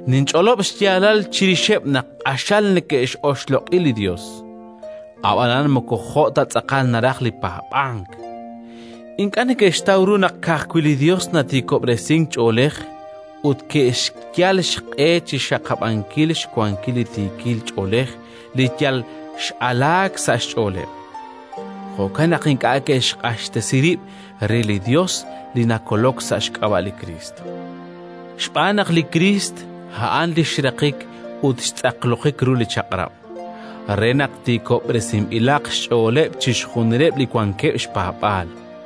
Ninch'olob' xyaalal chirixeb' naq q'axal neke'x'oxloq'i li Yos, ab'anan moko jo' ta tz'aqal naraj li paab'ank. Ink'a' neke'xtaw ru naq ka'ajwi' li Yos natiikob'resink ch'oolej ut ke'xyal xq'e chi xxaqab'ankil xwankil li tiikil ch'oolej li yal x'alaak sa' xch'ooleb'. Jo'kan naq ink'a' ke'xq'axtesi rib' re li Yos li nakolok sa' xk'ab'a' li Kriist. Xb'aan naq li Kriist a'an li xraqik ut xtz'aqlojik ru li Chaq'rab', re naq tiikob'resinb'ilaq xch'ooleb' chixjunileb' li wankeb' xpaab'aal.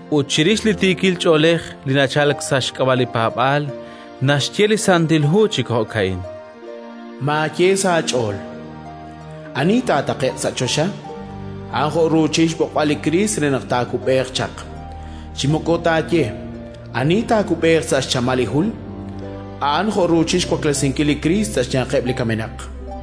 Ut chirix li tiikil ch'oolej li nachalk sa' xk'ab'a' li paab'aal naxye li Santil Ho chi jo'ka'in: “Maaye sa' aach'ool: «Ani taataqe'q sa' choxa?» -a'an jo' ruuchil xb'oqb'al li Kriist re naq taakub'eeq chaq-; chi moko taaye: «Ani taakub'eeq sa' xchamal li jul?»”. A'an jo' ruuchil xwaklesinkil li Kriist sa' xyanqeb' li kamenaq.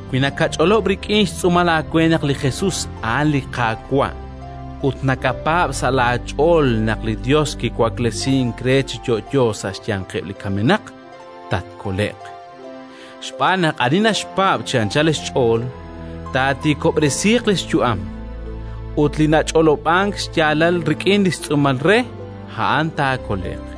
Wi nakach'olob' rik'in xtz'uumal aawe naq li Jesus a'an li Qaawa' ut nakapaab' sa' laach'ool naq li Yos kiwaklesink re chi yo'yo sa' xyanqeb' li kamenaq, tatkole'q. Xb'aan naq ani naxpaab' chi anchal xch'ool, taatiikob'resiiq li xyu'am, ut li nach'olob'ank xyaalal rik'in xtz'uumal re, a'an taakole'q.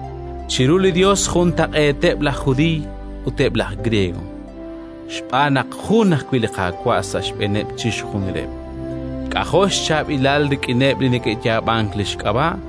Chiru li Yos juntaq'eeteb' laj Judiiy ut eb' laj Griego, xb'aan naq jun ajwi' li Qaawa' sa' xb'eeneb' chixjunileb', k'ajo' xchaab'ilal rik'ineb' li neke'yaab'ank li xk'ab'a'.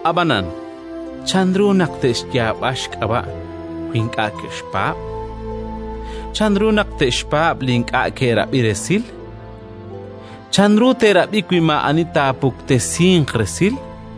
Ab'anan, chanru naq te'xyaab'a xk'ab'a' wi ink'a' ke'xpaab'? Chanru naq te'xpaab' li ink'a' ke'rab'i resil? Chanru te'rab'i wi maa'ani taapuktesinq resil?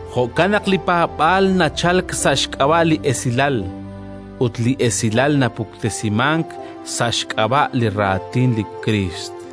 Jo'kan naq li paab'aal nachalk sa' xk'ab'a' li Esilal, ut li Esilal napuktesimank sa' xk'ab'a' li Raatin li Kriist.